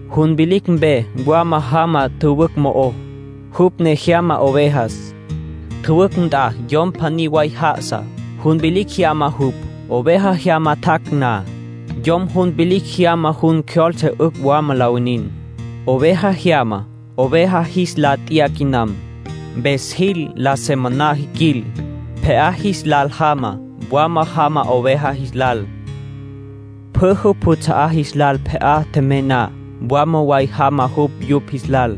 Jun vilicj mpe wama jama tjüwücj mo'ó, jupj ne jyama ovejas. Tjüwücj nt'a yom pjaní way já'asa, jun vilicj jyama jupj. Oveja jyama tjac' na, yom jun vilicj jyama jun cjyoltse 'ücj wama la winin. Oveja jyama oveja jis lá t'ya quinam, mpes jis lá se moná jiquil. Pje'á jis lal jama, mwalá jama oveja jis lal. Pjü jupj juts'a'á jis lal pje'á tjemey na, mwalá way jama jupj yupj jis lal.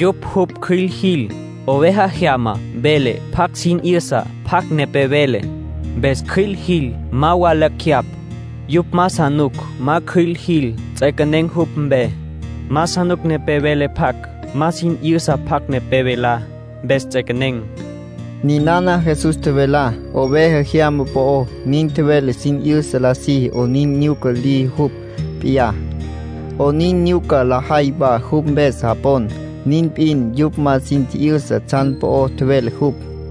Yupj jupj cjüil jil. Oveja jyama vele pjac sin 'yüsa pjacj nepé vele, mpes cjüil jil. Ma wa lacj jeyapj. Yupj ma sa nuc ma cjüil jil. Ts'equenen̈ jupj mpe. Ma sa nuc nepé vele pjac ma sin 'yüsa pjacj nepé velá, mpes ts'equenen̈. Ninana Jesús tjevelá oveja jyama po'ó. Nin tjevele sin 'yüsa la siji 'onin nyuca liji jupj p'iyá, 'onin nyuca lajay wa jupj mpes japon. Nin p'in, yupj ma sin tji'yüsa tsjan po'ó tjevele jupj.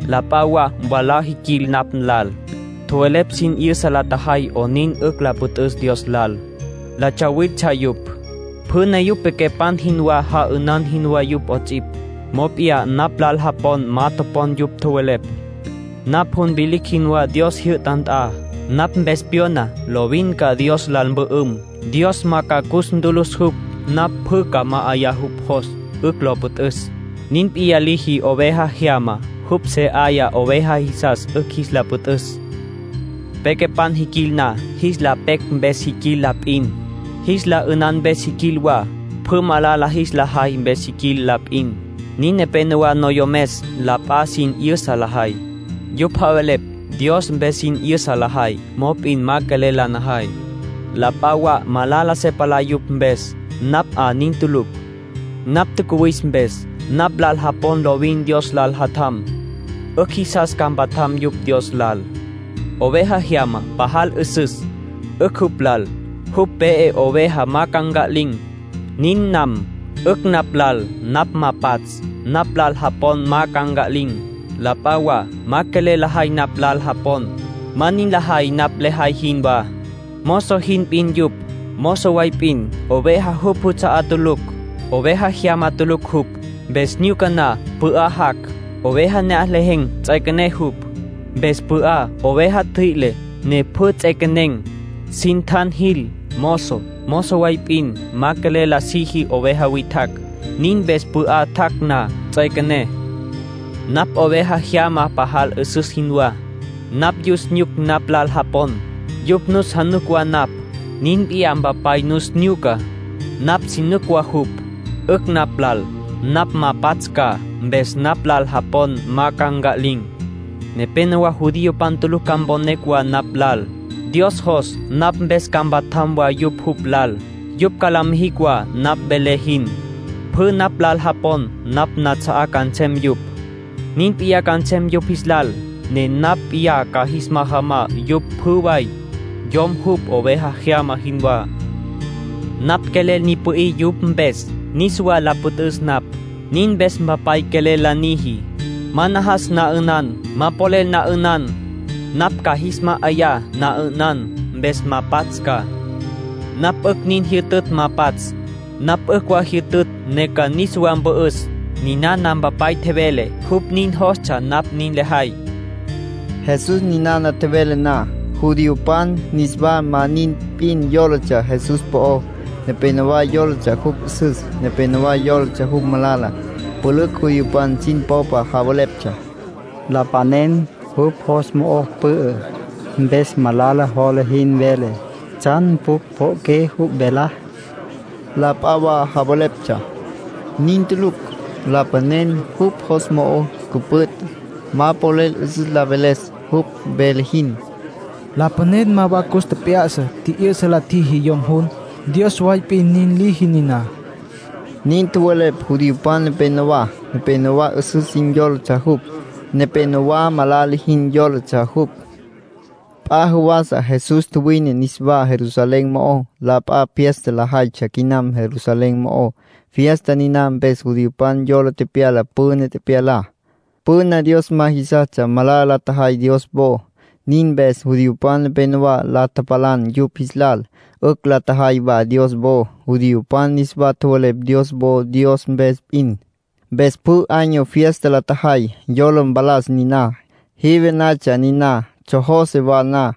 La p'a wa mwalá tjiquil napj lal, tjowelepj sin 'yüsa la tjajay 'onin 'ücj la püt'üs Dios lal. La tsawiltsja yupj. Pjü ne yupj pequepan jinwá, ja'ünan jinwá yupj 'ots'ipj. Mop'iyá napj lal japon ma topon yupj tjowelepj. Napj jun vilicj jinwá Dios jyü'ta nt'a. Napj mpes pyona, lovin ca Dios lal mpü'üm, Dios ma ca cus ntülüs jupj. Napj pjü ca ma'ayá jupj jos, 'ücj lo püt'üs. Nin p'iyá liji oveja jyamá. Jupj se 'aya oveja jisas 'ücj jis la püt'üs. ”Pequepan jiquil na, jis la pecj mpes jiquil la p'in. Jis la 'ünan mpes jiquil wa. Pjü malala jis la jay mpes jiquil la p'in. Nin nepenowá noyomes, la p'a sin 'yüsa lajay. Yupj javelepj Dios mpes sin 'yüsa lajay, mop'in ma quelel la najay. La p'a wa malala se palá yupj mpes. Napj 'a nin tulucj. Napj tjacuwis mpes, napj lal japon lovin Dios lal mpatjam. 'Ücj jisas ca mpatjam yupj Dios lal. ”Oveja jyama pajal 'üsüs, 'ücj jupj lal jupj pe'e oveja ma ca nca'lin̈. Nin nam. 'Ücj napj lal napj ma pats', napj lal japon ma ca nca'lin̈. La p'a wa ma quelel lajay napj lal japon, ma nin lajay napj lejay jinwá. Mozo jin p'in yupj. Mozo way p'in, oveja jupj juts'a'á tulucj. Oveja jyama tulucj jupj. Mpes nyuca na pü'á jac', oveja ne'aj lejen̈ ts'üequené jupj. Mpes pü'á oveja ntjüi'le, ne pjü ts'equenen̈, sin tjan jil. Mozo, mozo way p'in, ma quelel la siji oveja witjacj. Nin mpes pü'á tjac' na, ts'üequené. ”Napj oveja jyama pajal 'üsüs jinwá. Napj yus nyuc napj lal japon; yupj nus januc wa napj. Nin p'iyá Mpapay nus nyuca; napj si nuc wa jupj. 'Ücj napj lal napj ma pats' ca, mpes napj lal japon ma ca nca'lin̈. Nepénowa judiopan tulucj ca mponecj wa napj lal. Dios jos napj mpes ca mpatjam wa yupj jupj lal. Yupj ca la mijicj wa napj velé jin. Pjü napj lal japon napj nats'a'á ca nsem yupj. Nin p'iyá ca nsem yupj jis lal, ne napj p'iyá ca jis majamá yupj pjü way, yom jupj oveja jyama jinwá. ”Napj quelel ni pü'í yupj mpes, niswa la püt'üs napj. Nin mpes Mpapay quelel la niji. Ma najas na 'ünan, ma polel na 'ünan. Napj ca jis ma'ayá na'ünan, mpes ma pats' ca. Napj 'ücj nin jyütütj ma pats'. Napj 'ücj wa jyütütj ne ca niswa mpü'üs. Ninana Mpapay tjevele jupj nin jostsja napj nin lejay”, tjevele Jesús. Jesús ninana tjevele na, judiopan niswa ma nin p'in yólatsja Jesús po'ó. Nepénowa yólatsja jupj 'üsüs, nepénowa yólatsja jupj malala. Pülücj judiopan sin popa javeleptsja: “Lapanen jupj jos mo'o pü'ü, mpes malala jola jin vele. ¿Tsjan pjucj pjo'oqué jupj velá?” La p'a wa javeleptsja: “Nin tulucj. Lapanen jupj jos mo'o cüpüt', ma polel 'üsüs la veles, jupj vele jin. Lapanen ma wa cus tjep'ya'sa tji'yü'sa la tjiji yom jun. Dios way p'in nin liji niná”, nin tjowelepj judiopan nepenowá. Nepénowa 'üsüs jin yólatsja jupj; nepénowa malala jin yólatsja jupj. P'a jawasa Jesús tjuwine niswá Jerusalén mo'ó. La p'a fiesta lajaytsja quinam Jerusalén mo'ó. Fiesta niná mpes judiopan yola tepyala püna tepyalá. Püna Dios ma jisas malala la tjajay Dios wo. Nin mpes judiopan nepenowá la tapalan yupj jis lal. 'Ücj la tjajay wa Dios wo. Judiopan niswa tjowelepj Dios wo Dios mpes p'in. Mpes pjü año fiesta la tjajay, yola mpalas niná. Jive natsja niná, tsjojose wa na.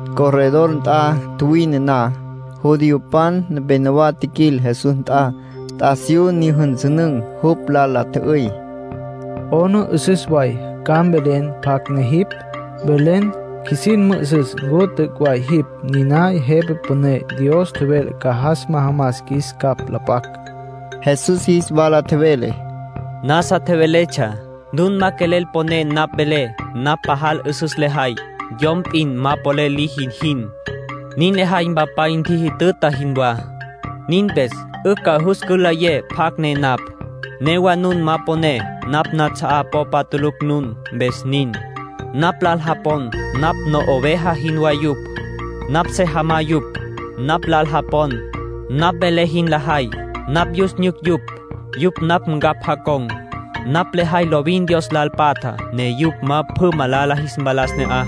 Corredor nt'a tjuwine na, judiopan nepenowá tjiquil Jesús nt'a, t'asiyú nyüjünsünün̈. Jupj lal la tjü'üy: —¿'Ona 'üsüs way ca mvelen pjacj ne jipj? Mvelen, qjuisin mü'üsüs ncu t'üc' way jipj niná Jepa Püné Dios tjevele ca jas majamas qjuis capj la p'acj. Jesús jis wala tjevele: —Nasa tjeveletsja. Nun ma quelel poné napj velé. Napj pajal 'üsüs lejay, yom p'in ma polel liji jin. Nin lejay Mpapay ntjijütüta jinwá. Nin mpes 'ücj ca jus cülayé pjacj ne napj. Newa nun ma poné. Napj nats'a'á popa tulucj nun, mpes nin. Napj lal japon, napj no'oveja jinwá yupj. Napj se jamá yupj. Napj lal japon, napj velé jin lajay. Napj yus nyuc yupj; yupj napj ncapj jacon̈. Napj lejay lovin Dios lal patja, ne yupj ma pjü malala jis mpalas ne'aj.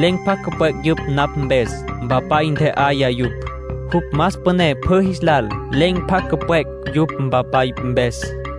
Len̈ pjacj cüpwec' yupj napj mpes. Mpapay ntje'aya yupj. Jupj más püné pjü jis lal. Len̈ pjacj cüpwec' yupj Mpapay mpes.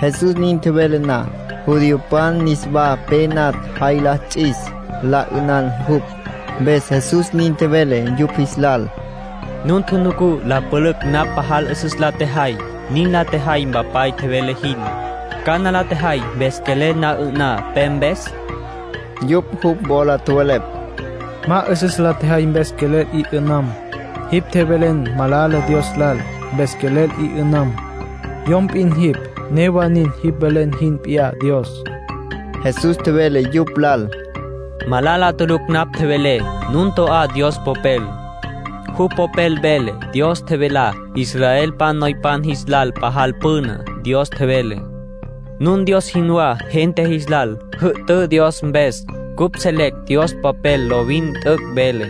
Jesús nin tjevele na, judiopan niswa pe natj jay la ts'is la 'ünan jupj. Mpes Jesús nin tjevele yupj jis lal: —Nun tjunucú la pülücj napj pajal 'üsüs la tjejay. Nin la tjejay Mpapay tjevele jin. ¿Cana la tjejay mpes quelel na 'ü'ná pe mpes? Yupj jupj wola tjowelepj: —Ma 'üsüs la tjejay mpes quelel 'i 'ü'nam. Jipj tjevelen malala Dios lal, mpes quelel 'i 'ü'nam. Yom p'in jipj; newa nin jipj velen jipj p'iyá Dios. Jesús tjevele yupj lal: —Malala tulucj napj tjevelé. Nun to'á Dios Popel. Jupj Popel vele Dios tjevelá israelpan noypan jis lal pajal püna. Dios tjevele: ‘Nun Dios jinwá gente jis lal. Jü'tǘ Dios mpes.’ Cupj selecj Dios Popel lovin t'üc' vele;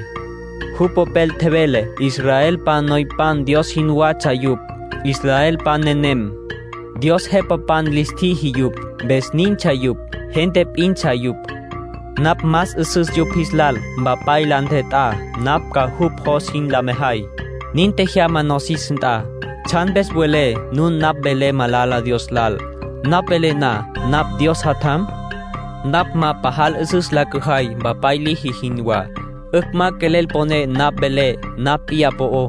jupj Popel tjevele israelpan noypan Dios jinwatsja yupj. Israelpan nenem, Dios jepapan lis tjiji yupj, mpes nintsja yupj. Gente p'intsja yupj. Napj más 'üsüs yupj jis lal. Mpapay la ntjet'á napj ca jupj jos jin la mejay. Nin tjejyama nosis nt'a. ¿Tsjan mpes welé nun napj velé malala Dios lal, napj velé na napj Dios Jatjam? Napj ma pajal 'üsüs la cüjay Mpapay liji jinwá, 'ücj ma quelel poné napj velé napj p'iyá po'ó.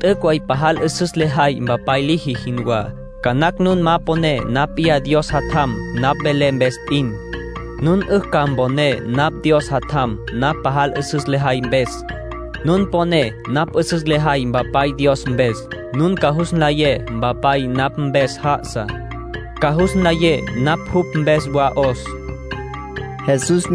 T'üc' way pajal 'üsüs lejay Mpapay liji jinwá. Ca nacj nun ma poné napj p'iyá Dios Jatjam napj velé mpes p'in. Nun 'ücj ca mponé napj Dios Jatjam napj pajal 'üsüs lejay mpes. Nun poné napj 'üsüs lejay Mpapay Dios mpes, nun ca jus nlayé Mpapay napj mpes já'asa, ca jus nlayé napj jupj mpes wa 'os —nin tjevele Jesús.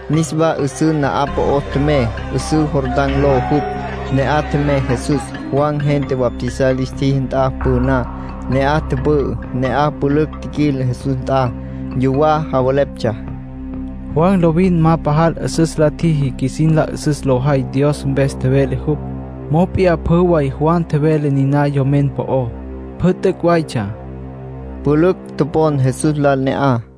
Niswa 'üsǘ na'aj po'ó tjemey, 'üsǘ Jordán ló jupj. Ne'aj tjemey Jesús, Juan gente bautizar lis tjiji nt'a püná. Ne'aj tüpü'ü. Ne'aj pülücj tjiquil Jesús nt'a. Yuwá javeleptsja: “Juan lovin ma pajal 'üsüs la tjiji qjuisin la 'üsüs lo jay Dios mpes tjevele jupj. Mop'iyá pjü way Juan tjevelá niná yomen po'ó, pjü t'üc' waytsja.” Pülücj topon Jesús lal ne'aj.